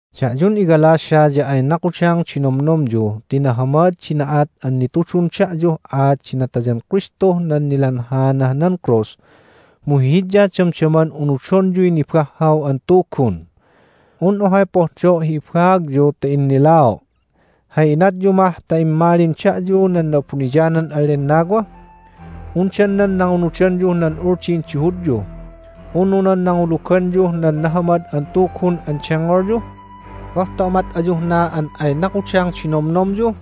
Da'yun iGalatia ya ay nakudang di nomnomyu ti nahamad di na'at an nitudun da'yuh aat di natayan Kristuh nan nilanhaanah nan krus! Mu hihidya damdaman unudonyuy nibahhaw an tugun. Un ohay pohdo' hi ibaagyu ta innilao': Hay inatyu mah ta immalin da'yu nan Na'abuniyanan an Lennawa? Undan nan nangunudanyuh nan Uldin di Hudyu, unu nan nanguluganyuh nan Nahamad an Tugun an dengngolyu? Goh ta umat ayuh na an ay nakudang di nomnomyu?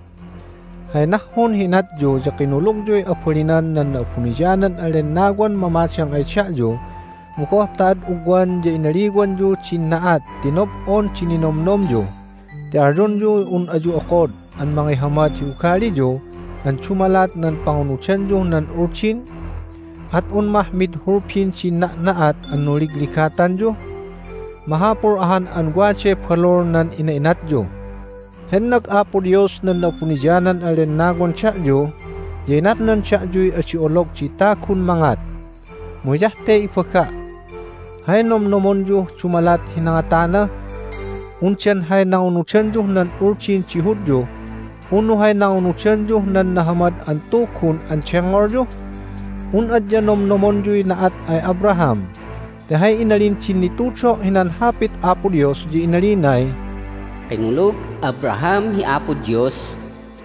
Hay nahhun hi inatyu ya kinulugyuy abalinan nan Na'abuniyanan an Lennawan mamadang ay da'yu, mu goh ta ad ugwan ya inaliwanyu din na'at ti nob'on di ninomnomyu, ti alyonyuy un ayu okod an mangihamad hi ugaliyu an dumalat nan pangunudanyuh nan Uldin? At un mah mid hulbin din na'na'at an nunligligatanyu? Mahapul ahan an waday balul nan ina'inatyu! Hennag Apo Dios nan Na'abuniyanan an Lennawan da'yu, ya inatnan da'yuy adi olog di tagun mangat. Mu hiyah te ibaga': Hay nomnomonyuh dumalat hi nangatana---undan hay nangunudanyuh nan Uldin di Hudyu, unu hay nangunudanyuh nan Nahamad an Tugun an dengngolyu? Un adya nomnomonyuy na'at ay Abraham, ti hay inalin din nitudo' hinan Hapit Apo Dios ya inalinay, "Kinulug Abraham hi Apo Dios,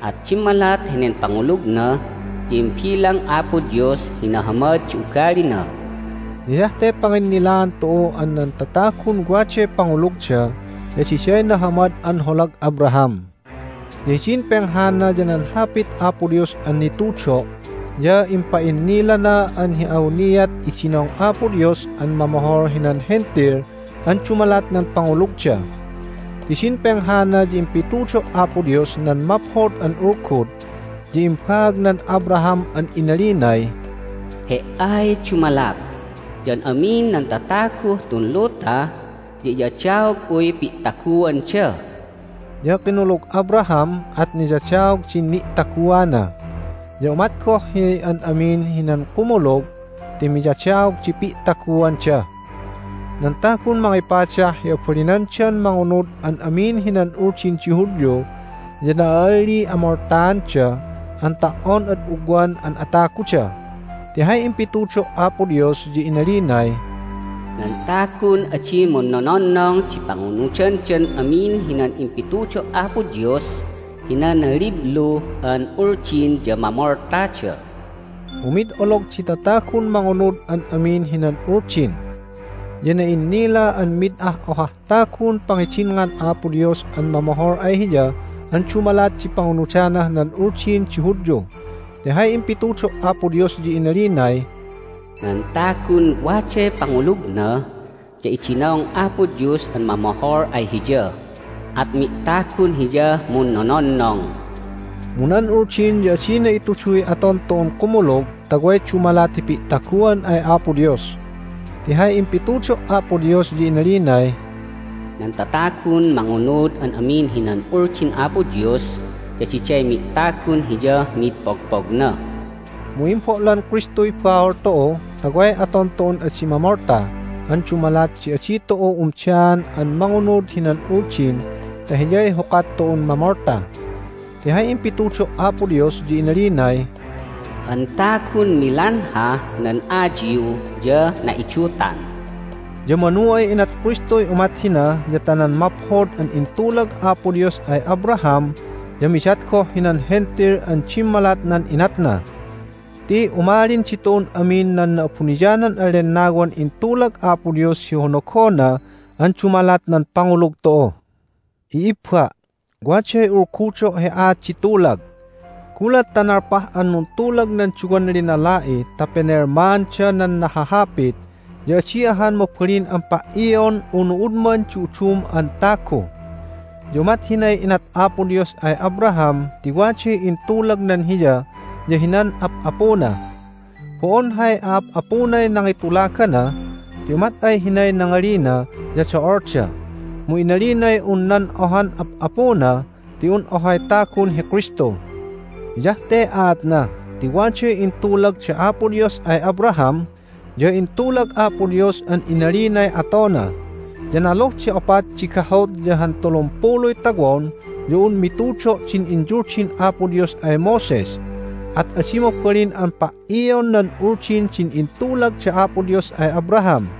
at dimmalat henen pangulugna ya imbilang Apo Dios hi nahamad di ugalina." Ya hiyah te panginnilaan tu'u an nan tatagun waday pangulugda ya diday nahamad an holag Abraham. Ya hidin penghana ya nan Hapit Apo Dios an nitudo' ya impa'innilana an hi awniat idinong Apo Dios an mamohol hinan Hentil an dumalat nan pangulugda. Ti din penghana ya impitudo' Apo Dios nan Maphod an Ulgud, ya imbaagnan Abraham an inalinay, "He"ay dumalat, ya an amin nan tataguh tun luta ya iyadaog'uy pi'taguanda." Ya kinulug Abraham, at niyadaog din ni'taguana. Ya umat goh hi an amin hinan kumulug ti miyadaog di pi'taguanda. Nan tagun mangipadah hi abalinandan mangunud an amin hinan Uldin di Hudyu ya na'a'alliy amoltaanda an ta"on ad ugwan an ataguda. Ti hay impitudo' Apo Dios ya inalinay, "Nan tagun adi munnononnong di pangunudandan amin hinan impitudo' Apo Dios hinan liblu an Uldin ya mamoltada." Mu mid olog di tatagun mangunud an amin hinan Uldin. Ya na'innila an mid ah ohah tagun pangidinngan Apo Dios an mamohol ay Hiya an dumalat di pangunudanah nan Uldin di Hudyu. Ti hay impitudo' Apo Dios ya inalinay, "Nan tagun waday pangulugna ya idinong Apo Dios an mamohol ay hiya, at mi'tagun Hiyah munnononnong." Mu nan Uldin ya adina ituduy aton tu'un kumulug ta way dumalat hi pi'taguan ay Apo Dios. Ti hay impitudo' Apo Dios ya inalinay, "Nan tatagun mangunud an amin hinan Uldin Apo Dios ya diday mi'tagun Hiyah mid pogpogna." Mu imbo'lan Kristuy bahol tu'u ta way aton tu'un adi mamolta an dumalat di adi tu'u umdaan an mangunud hinan Uldin ta Hiyay hukat tu'un mamolta. Ti hay impitudo' Apo Dios ya inalinay, "Han tagun milanhah nan ayiw ya na'idutan." Ya manu ay inat Kristuy umat hina ya ta nan maphod an intulag Apo Dios ay Abraham ya midat goh hinan Hentil an dimmalat nan inatna. Ti umalin ditu'un amin nan Na'abuniyanan an Lennawan intulag Apo Dios hi honogona an dumalat nan pangulug tu'u. I'ibba', waday ulgudo' hi aat di tulag: Gulat ta nalpah an nuntulag nan duwan linala'i ta pinelmaanda nan nahahapit ya adi ahan mabalin an pa"ion unu udman di udum an tagu. Ya umat hinay inat Apo Dios ay Abraham ti waday intulagnan hiya ya hinan ap'apuna. Bo'on hay a'ap'apunay nangitulagana, ti umat ay hinay nangalina ya do'olda. Mu inalinay un nan ohan ap'apuna ti un ohay tagun hi Kristu. Hiyah te aatna ti waday intulag da Apo Dios ay Abraham, ya intulag Apo Dios an inalinay atona. Ya naluh di opat di gahut ya han tulumpuluy tawon ya un mitudo' din inyuldin Apo Dios ay Moses, at adi mabalin an pa"ion nan Uldin din intulag da Apo Dios ay Abraham,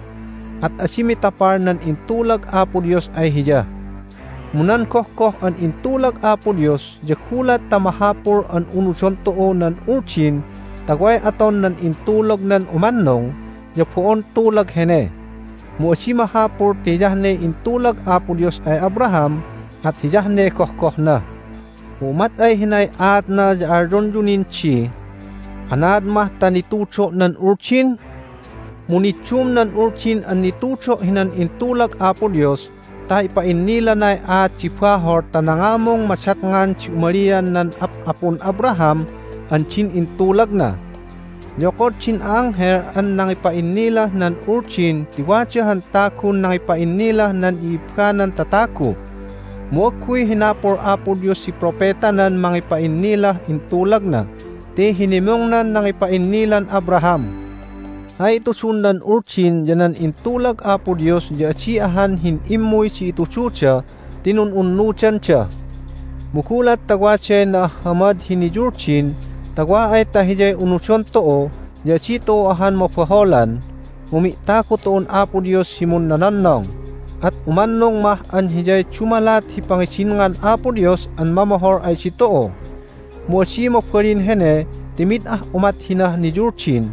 at adi mitapal nan intulag Apo Dios ay hiya. Mu nan gohgoh an intulag Apo Dios ya gulat ta mahapul an unudon tu'u nan Uldin ta way aton nan intulagnan umannung ya bo'on tulag hene. Mu adi mahapul ti hiyah ne intulag Apo Dios ay Abraham, at hiyah ne gohgohna. Mu umat ay hinay aatna ya alyonyu nin di, "Anaad mah ta nitudo' nan Uldin?" Mu niddum nan Uldin an nitudo' hinan intulag Apo Dios ta ipa'innilanay aat di bahol ta nangamung madatngan di umalian nan Ap'apun Abraham an din intulagna. Ya okod din a'anghel an nangipa'innilah nan Uldin ti wada han tagun nangipa'innilah nan i'ibbanan tatagu. Mu agguy hinapul Apo Dios di propetanan mangipa'innilah intulagna ti hinimungnan nangipa'innilan Abraham. Hay itudun nan Uldin ya nan intulag Apo Dios ya adi ahan hin'immuy di itududa ti nun'unnudanda. Mu gulat ta waday na'ahhamad hi niyuldin ta wa ay ta hiyay unudon tu'u ya adi tu'u ahan mabaholan, mu mi'tagu tu'un Apo Dios hi munnononnong, at umannung mah an hiyay dumalat hi pangidinngan Apo Dios an mamohol ay ditu'u. Mu adi mabalin hene ti mid ah umat hinah niyuldin,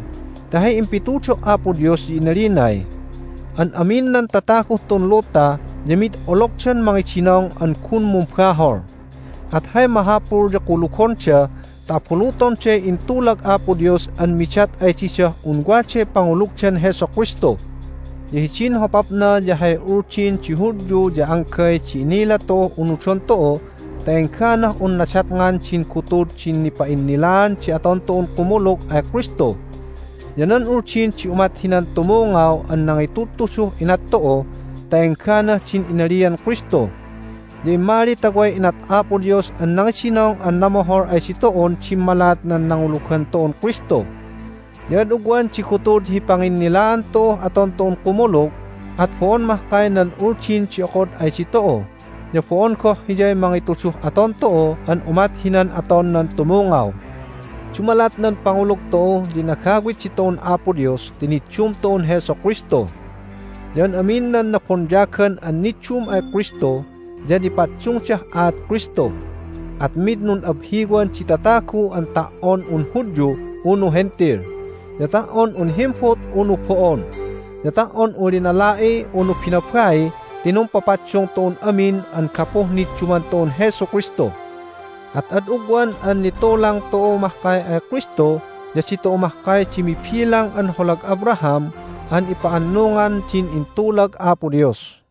ti hay impitudo' Apo Dios ya inalinay, "An amin nan tataguh tun luta ya mid ologdan mangidinong an gun mumbahol." At hay mahapul ya kulugonda ta abulutonday intulag Apo Dios an midat ay didah un waday pangulugdan Jesu Kristu. Ya hidin hopapna ya hay Uldin di Hudyu ya anggay di innila tu'uh unudon tu'u ta engganah un nadatngan din gutud din nipa'innilaan di aton tu'un kumulug ay Kristu. Ya nan Uldin di umat hinan tumungaw an nangitudtuduh inat tu'u ta engganah din inalian Kristu. Ya immali ta way inat Apo Dios an nangidinong an namohol ay ditu'un dimmalat nan nangulugan tu'un Kristu. Ya ad ugwan di gutud hi panginnilaan tu'uh aton tu'un kumulug, at bo'on mahkay nan Uldin di okod ay ditu'u, ya bo'on goh hiyay mangituduh aton tu'u an umat hinan aton nan tumungaw. Dumalat nan pangulug tu'u ya inagawit ditu'un Apo Dios ti niddum tu'un Jesu Kristu. Ya an amin nan nabonyagan an niddum ay Kristu ya nipaddungdah aat Kristu. At mid nun'abhiwan di tatagu an ta"on un Hudyu unu Hentil, ya ta"on un himbut unu bo'on, ya ta"on un linala'i unu binabai ti numpapaddung tu'un amin an gapuh nidduman tu'un Jesu Kristu. At ad ugwan an nitulang tu'u mahkay ay Kristu ya ditu'u mahkay di mibilang an holag Abraham an ipa'annungan din intulag Apo Dios.